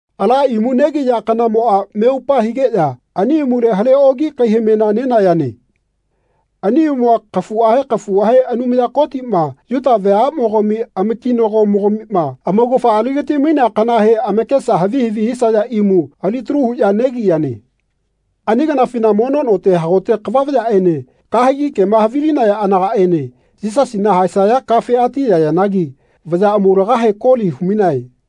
Ala imu negiya kanamoꞌa meupa higeꞌya ani imule hale oki kaihamena nenayane. Ani imua kafuꞌahe kafuꞌahe Anumaya Kotiꞌma Yuta veaꞌmogami amakinago-mogamima amaugafa aligatimainea kanahe amakesa havi havi hisaya imu alitalu huꞌya negiyane. Ani kanafina mono note hagote kava vayaꞌene kahegi kema havilinaya anagaꞌene Yisasina haesaya kafe atiyayanagi vaya amaulagahe koli humainae.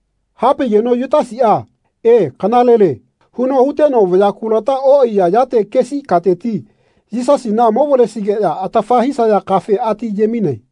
Hapaigeno Yutasiꞌa “E, kanalele” huno huteno vaya kulata oꞌaiya yate kesi kateti Yisasina movalesigeꞌya atafa hisaya kafe ati ayemaine.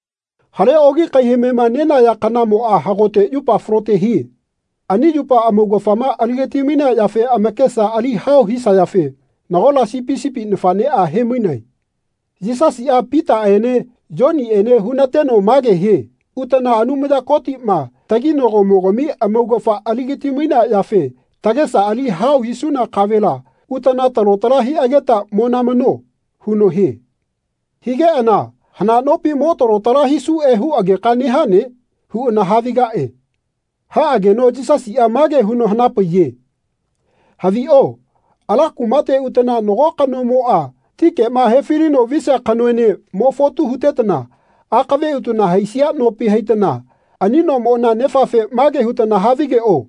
Hale oki kaihamema nenaya kanamoꞌa hagote yupa falote hie. Ani yupa amaugafama aligatimainea yafe amakesa ali hao hisayafe nagola sipi sipi nafaꞌneꞌa hemainae. Yisasiꞌa Pitaꞌene Yoniꞌene hunateno mage hie “Utana Anumaya Kotiꞌma taginagomogami amaugafa aligatimainea yafe tagesa ali hao hisuna kavela utana talo tala hiꞌageta monamano.” huno hie. Higeꞌana “Hana nopi mo lalo tala hisuꞌe huꞌageka nehane?” huꞌana havigaꞌe. Haꞌageno Yisasiꞌa mage huno hanapaiye “Haviꞌo ala kumate utana nago kanomoꞌa ti kema hefilino visia kanoene mo fotu hutetana akave utana haisia nopi haitana ani nomona nefafe mage hutana havigeꞌo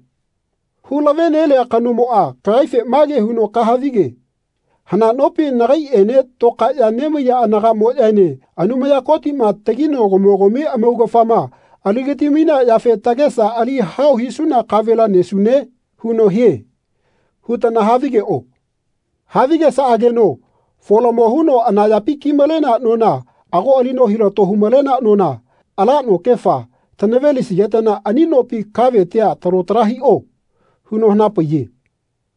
‘Hulavenelia kanomoꞌa kagaife mage huno kahavige ‘Hana nopi nagaiꞌene tokaeꞌya nemaiya anagaꞌmoꞌyaene Anumaya Kotiꞌma taginagomogami amaugafama aligatimainea yafe tagesa ali hao hisuna kavela nesune?’ huno hie.’ hutana havigeꞌo. Havigesaꞌageno folamo huno anayapi kimalenea nona ago alino hilato humalenea nona, ala nokefa, tanavelisigetana ani nopi kavetia talo tala hiꞌo.” huno hanapaiye.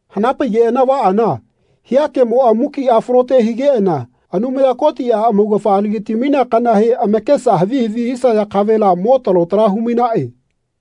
Hanapaigeꞌana vaꞌana hia kemoꞌa mukiꞌa falote higeꞌana Anumaya Kotiꞌa amaugafa aligatimainea kanahe amakesa havi havi hisaya kavela mo lalo tala humainaꞌe.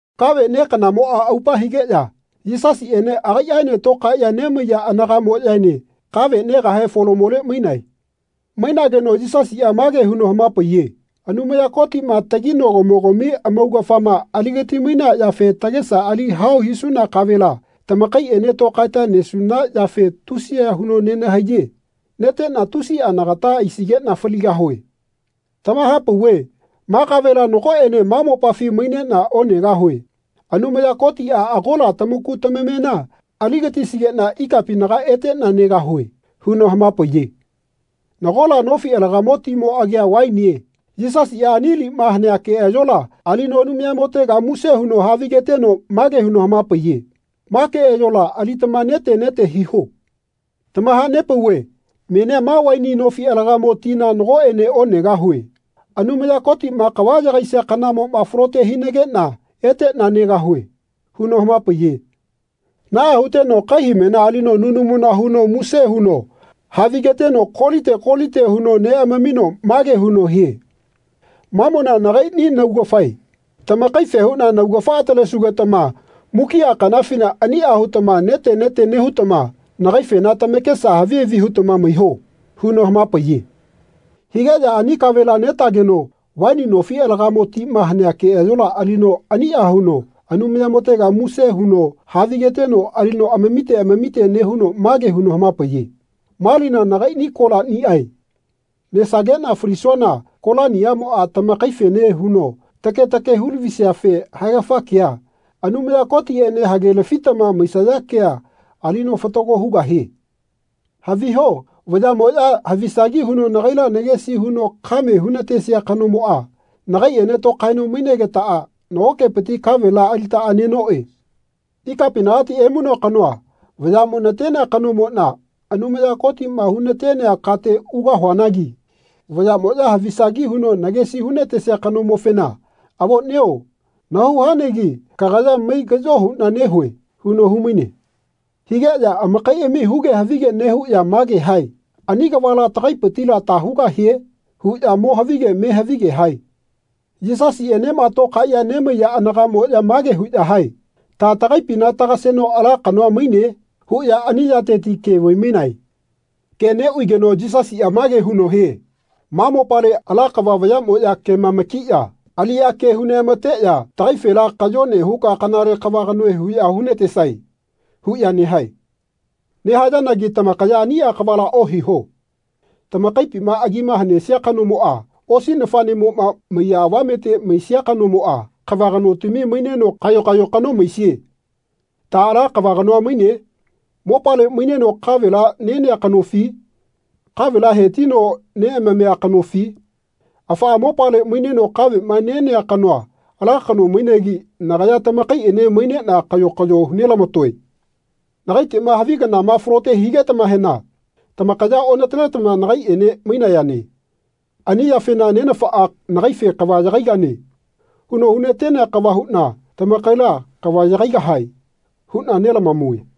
Kave ne kanamoꞌa aupa higeꞌya Yisasiꞌene agaiꞌaene tokaeꞌya nemaiya anagaꞌmoꞌyaene kave negahe folamole mainae. Mainageno Yisasiꞌa mage huno hamapaiye “Anumaya Kotiꞌma taginagomogami amaugafama aligatimainea yafe tagesa ali hao hisuna kavela tamakaiꞌene tokaeta nesuna yafe tusiya huno nenahaiye. Neteꞌna tusiꞌa nagata aisigeꞌna faligahue. Tamahapauve ma kavela nagoꞌene ma mopafi maineꞌna onegahue. Anumaya Kotiꞌa agola tamaku tamamena aligatisigeꞌna ikapinaga eteꞌna negahue.” huno hamapaiye. Nagola nofi alagamo timo agia vainie. Yisasiꞌa ani lima hanea keꞌayola alino Anumayamotega muse huno havigeteno mage huno hamapaiye “Ma keꞌayola alitama nete nete hiho. Tamahanepauve menia ma vaini nofi alagamo tina nagoꞌene onegahue. Anumaya Kotiꞌma kava yagaisia kanamoꞌma falote hinageꞌna eteꞌna negahue.” huno hamapaiye. Naꞌa huteno kaihamena alino nunamu huno muse huno havigeteno kolite kolite huno neꞌamamino mage huno hie “Mamona nagaiꞌni naugafae. Tamakaife huꞌna naugafa atalesugetama mukiꞌa kanafina aniꞌa hutama nete nete nehutama nagaifena tamakesa havi havi hutama maiho.” huno hamapaiye. Higeꞌya ani kavela netageno vaini nofi alagamo tima hanea keꞌayola alino aniꞌa huno Anumayamotega muse huno havigeteno alino amamite amamite nehuno mage huno hamapaiye “Ma lina nagai kolaniꞌae. Nahaesageꞌna falisuana kolaniꞌamoꞌa tamakaifene huno take take hulavisiafe haegafa kea, Anumaya Kotiꞌene hage-lafitama maisaya kea alino fatago hugahie. Haviho vayaꞌmoꞌya havisagi huno nagaila nagesi huno kame hunatesia kanomoꞌa nagaiꞌene tokaeno mainegetaꞌa nagokepiti kavela alitaꞌa nenoꞌe. Ikapinagati emainoa kanoa vayaꞌmo natenea kanomoꞌna Anumaya Kotiꞌma hunatenea kate ugahuanagi vayaꞌmoꞌya havisagi huno nagesi hunatesia kanomofena ‘Avoꞌnio nahau hanagi kagaya maigaꞌyo huꞌna nehue.’ huno humaine.” Higeꞌya amakaiꞌami huge havige nehuꞌya mage hae “Ani kavala tagaipitila ta hugahie?” huꞌya mo havige me havige hae. Yisasiꞌenema tokaeꞌya nemaiya anagamoꞌya mage huꞌya hae “Ta tagaipina tagaseno ala kanoa maine?” huꞌya ani yateti ke vaimainae. Ke neꞌvaigeno Yisasiꞌa mage huno hie “Ma mopale ala kava vayamoꞌya kemamakiꞌya aliꞌya ke huneꞌamateꞌya ‘Tagaifela kayone huka kanale kava kanoe huꞌya hunatesae.’ huꞌya nehae. Nehayanagi tamakaya aniꞌa kavala ohiho. Tamakaipima agima hanesia kanomoꞌa osi nafaꞌnemoꞌma maiya avamete maisia kanomoꞌa kava kanotami maineno kayo kayo kano maisie. Ta ala kava kanoa maine? Mopale maineno kavela nenea kanofi? Kavela hatino neꞌamamia kanofi? Afaꞌa mopale maineno kaveꞌma nenea kanoa ala kano mainegi nagaya tamakaiꞌene maineꞌna kayo kayo hunelamatoe. Nagaiteꞌma havi kanama falote higetamahena tamakaya onataletama nagaiꞌene mainayane. Ani yafena Nenafaꞌa nagaife ‘Kava yagaigane.’ huno hunatenea kava huꞌna tamakaila ‘Kava yagaigahae.’ huꞌna nelamamue.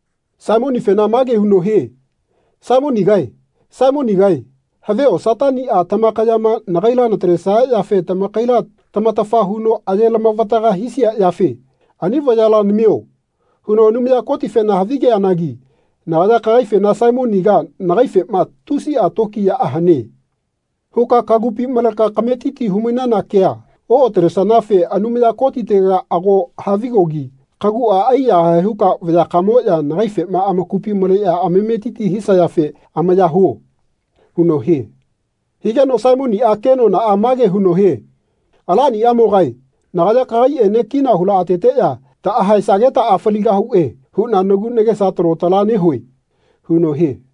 Saimonifena mage huno hie “Saimonigae, Saimonigae havio Sataniꞌa tamakayama nagaila natalesaya yafe tamakaila tamatafa huno ayelamavataga hisia yafe ‘Ani vayala namio.’ huno Anumaya Kotifena havigeanagi nagaya kagaifena Saimoniga nagaifema ‘Tusiꞌa tokiyaꞌa hane.’ huka kagupi maleka kametiti humainana kea oꞌatalesanafe Anumaya Kotitega ago havigogi kaguꞌa aiyahae huka vayakamoꞌya nagaifema amakupi maleꞌya amametiti hisayafe amaya huo.” huno hie. Higeno Saimoniꞌa kenonaꞌa mage huno hie “Alaniꞌamogae nagaya kagaiꞌene kina hulaꞌateteꞌya taꞌahaesagetaꞌa faligahuꞌe huꞌna nagu nagesa talo tala nehue.” huno hie.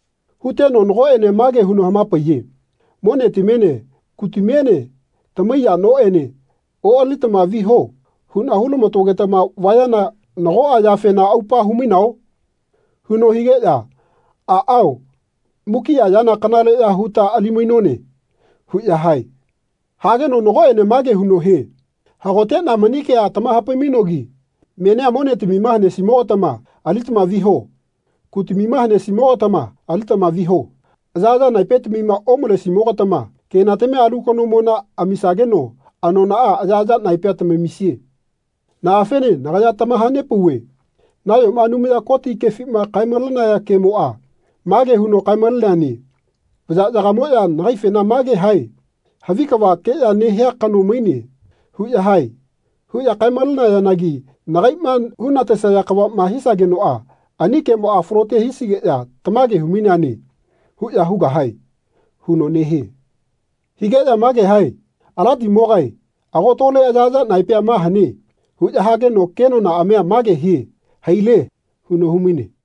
Huteno nagoꞌene mage huno hamapaiye “Monetamiene kutamiene tamaiya noꞌene oꞌalitama viho huꞌna hulamatogetama vayana nagoꞌa yafena aupa humainao?” huno higeꞌya “Aꞌao mukiꞌa yana kanaleꞌya huta alimainone.” huꞌya hae. Hageno nagoꞌene mage huno hie “Hagoteꞌna mani kea tamahapai-mainoanagi menia monetamima hanesimogatama alitama viho. Kutamima hanesi-mogatama alitama viho. Ayaꞌaya naepetamima omalesi-mogatama kenatamia alu kanomona amisageno anonaꞌa ayaꞌaya naepea tamamisie. Naꞌafene nagaya tamahanepauve nayona Anumaya Koti kefima kae-malenaya kemoꞌa mage huno kae-maleneane ‘Vayaꞌyagamoꞌya agaifena mage hae ‘Havi kavakeꞌya nehia kano maine.’ huꞌya hae.’ huꞌya kae-malenayanagi nagaiꞌma hunatesaya kavaꞌma hisagenoꞌa ani kemoꞌa falote hisigeꞌya ‘Tamage humaineane.’ huꞌya hugahae.” huno nehie. Higeꞌya mage hae “Alatimogae ago tole ayaꞌaya naepea ma hane.” huꞌya hageno kenonaꞌamia mage hie “Haile.” huno humaine.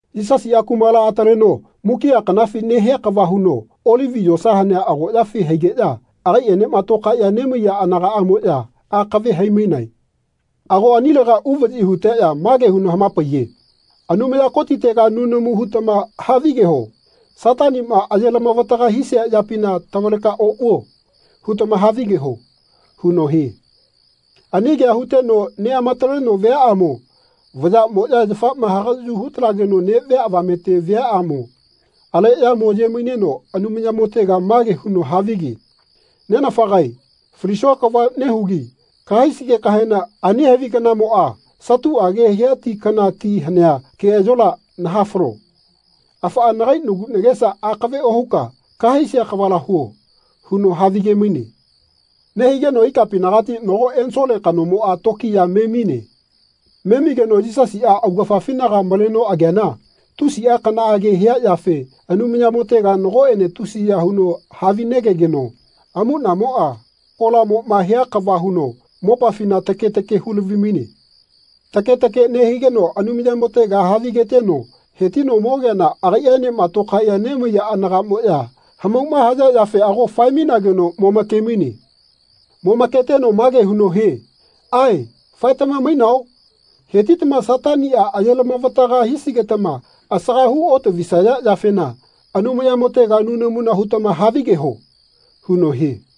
Yisasiꞌa kumala ataleno mukiꞌa kanafi nehia kava huno Olivi yosa hanea agoꞌyafi haigeꞌya agaiꞌenema tokaeꞌya nemaiya anagaꞌamoꞌya akave haimainae. Ago anilega uvaꞌyi huteꞌya mage huno hamapaiye “Anumaya Kotitega nunamu hutama havigeho ‘Sataniꞌma ayelavataga hisia yapina tavaleka oꞌvuo.’ hutama havigeho.” huno hie. Ani kea huteno neꞌamataleno viaꞌamo vayaꞌmoꞌya yafama hagaꞌyu hutalageno neꞌvia avamete viaꞌamo aleꞌya moye maineno Anumayamotega mage huno havige “Nenafagae falisua kava nehugi kahaisigekahena ani havi kanamoꞌa satuꞌage hia ti kana ti hanea keꞌayola nahafalo. Afaꞌa nagai nagu nagesa akave ohuka kahaisia kavala huo.” huno havige-maine. Nehigeno ikapinagati nago ensole kanomoꞌa tokiya memine. Memigeno Yisasiꞌa augafafinaga malageno ageana tusiꞌa kanaꞌage haiya yafe Anumayamotega nagoꞌene tusiya huno havinegegeno amuꞌnamoꞌa kolamoꞌma hia kava huno mopafina take take hulavimaine. Take take nehigeno Anumayamotega havigeteno hetino mogeana agaiꞌaenema tokaeꞌya nemaiya anagaꞌmoꞌya hamauma haya yafe ago fae-mainageno momake-maine. Momaketeno mage huno hie “Ae faetamage mainao? Hetitama Sataniꞌa ayelama-vataga hisigetama asaga hu otavisaya yafena Anumayamotega nunamuna hutama havigeho.” huno hie.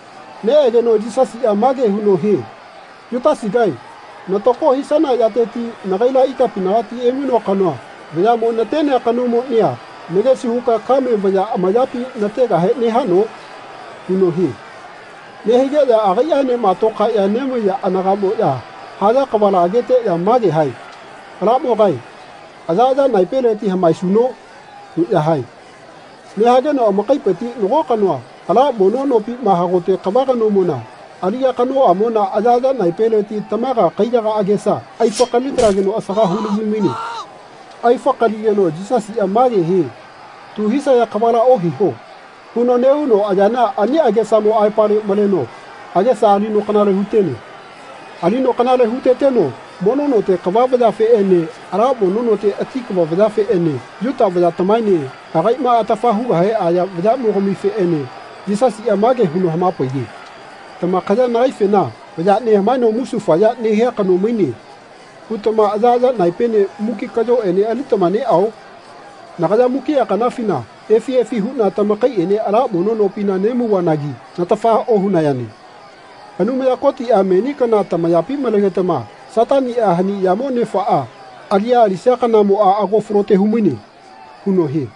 Neꞌegeno Yisasiꞌa mage huno hie “Yutasigae natako hisana yateti nagaila ikapinagati emainoa kanoa vayaꞌmo natenea kanomonia nagesi huka kame vaya amayapi nategahe nehano?” huno hie. Nehigeꞌya agaiꞌaenema tokaeꞌya nemaiya anagaꞌmoꞌya haya kavala ageteꞌya mage hae “Alamogae ayaꞌaya naepeleti hamaesuno?” huꞌya hae. Nehageno amakaipiti nago kanoa ala mono nopima hagote kava kanomona aliꞌya kanoꞌamona ayaꞌaya naepeleti tamaga kaiyaga agesa aifakali-talegeno asaga hulavimaine. Aifakaligeno Yisasiꞌa mage hie “Tu hisaya kavala ohiho.” huno nehuno ayana ani agesamo aepale maleno agesa alino kanale hutene. Alino kanale huteteno mono note kava vayafeꞌene ala mono note ati kava vayafeꞌene Yuta vayatamaene agaiꞌma atafa hugahe aya vayaꞌmogamifeꞌene Yisasiꞌa mage huno hamapaiye “Tamakaya nagaifena ‘Vaya nehamaeno musufaya nehia kano maine.’ hutama ayaꞌaya naepene muki kaꞌyoꞌene alitama neꞌao? Nagaya mukiꞌa kanafina efi efi huꞌna tamakaiꞌene ala mono nopina nemauvanagi natafa ohunayane. Anumaya Kotiꞌa meni kana tamayapi malegetama Sataniꞌa hani yamo nefaꞌa aliꞌya alisia kanamoꞌa ago falote humaine.” huno hie.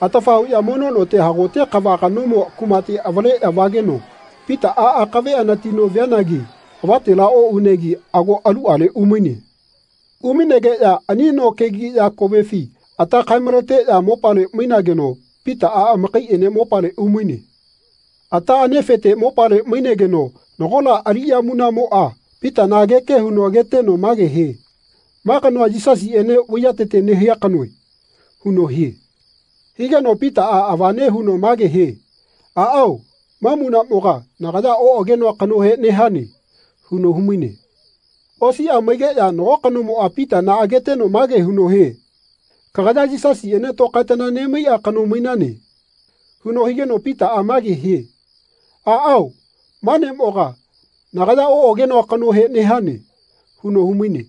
Atafa huꞌya mono note hagote kava kanomo kumate avaleꞌya vageno Pitaꞌa akave anatino vianagi avatela oꞌunegi ago aluꞌale umaine. Umainegeꞌya ani no kegiꞌya kovefi ata kae-maleteꞌya mopale mainageno Pitaꞌa amakaiꞌene mopale umaine. Ata anefete mopale mainegeno nagola aliꞌya munaꞌmoꞌa Pitana ageke huno ageteno mage hie “Ma kanoa Yisasiꞌene vaiyatete nehia kanoe.” huno hie. Higeno Pitaꞌa avane huno mage hie “Aꞌao ma munaꞌmoga nagaya oꞌagenoa kanohe nehane.” huno humaine. Osiꞌa maigeꞌya nago kanomoꞌa Pitana ageteno mage huno hie “Kagaya Yisasiꞌene tokaetana nemaiꞌa kano mainane.” huno higeno Pitaꞌa mage hie “Aꞌao ma neꞌmoga nagaya oꞌagenoa kanohe nehane.” huno humaine.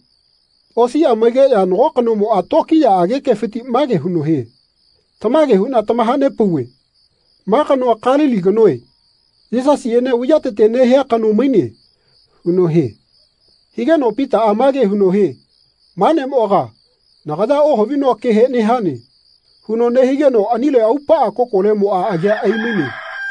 Osiꞌa maigeꞌya nago kanomoꞌa tokiyaꞌage kefiti mage huno hie “Tamage huꞌna tamahanepauve ma kanoa Kalili kanoe. Yisasiꞌene vaiyatete nehia kano maine.” huno hie. Higeno Pitaꞌa mage huno hie “Ma neꞌmoga nagaya ohavinoa kehe nehane.” huno nehigeno anile aupaꞌa kokolemoꞌa agea aimaine.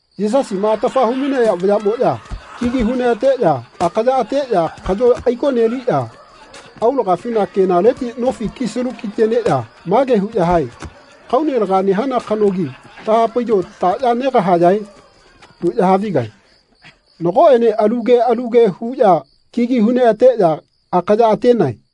Yisasima atafa humainaya vayaꞌmoꞌya kigi huneꞌateꞌya akaya ateꞌya kaꞌyo aikoneliꞌya aulagafina kenaleti nofi kisalu kiteneꞌya mage huꞌya hae “Kaune laga nehana kanogi tahapaiyo taꞌya negahayae?” huꞌya havigae. Nagoꞌene alu ke alu ke huꞌya kigi huneꞌateꞌya akaya atenae.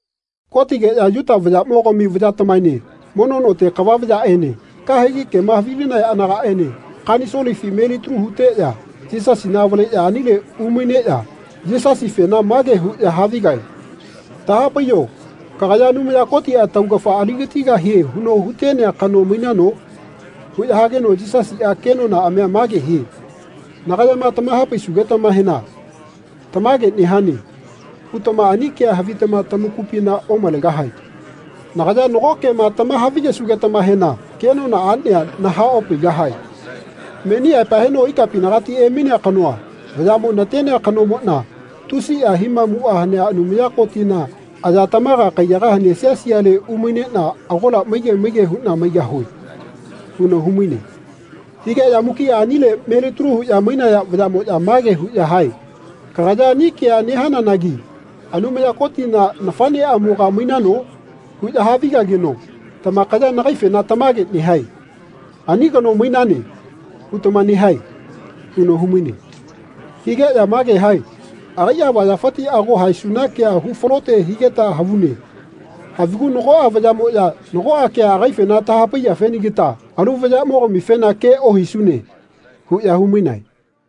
Kotigeꞌya Yuta vayaꞌmogami vayatamaene mono note kava vayaꞌene kahegi kema havilinaya anagaꞌene kanisolefi melitalu huteꞌya Yisasina avaleꞌya anile umaineꞌya Yisasifena mage huꞌya havigae. “Tahapaiyo kagaya Anumaya Kotiꞌa taugafa aligatigahie huno hugatenea kano mainano?” huꞌya hageno Yisasiꞌa kenonaꞌamia mage hie “Nagayama tamahapaisugetamahena ‘Tamage nehane.’ hutama ani kea havitama tamakupina omalegahae. Nagaya nago kema tamahavigesugetamahena kenonaꞌania nahaꞌopaigahae. Meni aepa heno ikapinagati emainoa kanoa vayaꞌmo natenea kanomoꞌna tusiꞌa himamuꞌa hanea Anumaya Kotina aya tamaga kaiyaga hanea siale umaineꞌna agola maige maige huꞌna maigahue.” huno humaine. Higeꞌya mukiꞌa anile melitalu huꞌya mainaya vayaꞌmoꞌya mage huꞌya hae “Kagaya ani kea nehananagi Anumaya Kotina nafaꞌneꞌamoga mainano?” huꞌya havigageno “Tamakaya nagaifena tamage nehae. ‘Ani kano mainane.’ hutama nehae.” huno humaine. Higeꞌya mage hae “Agaiꞌa avayafiti ago haesuna kea hufalote higeta havune. Havigu nagoꞌa vayaꞌmoꞌya nagoꞌa kea agaifena tahapaiyafenagita alu vayaꞌmogamifena ke ohisune.” huꞌya humainae.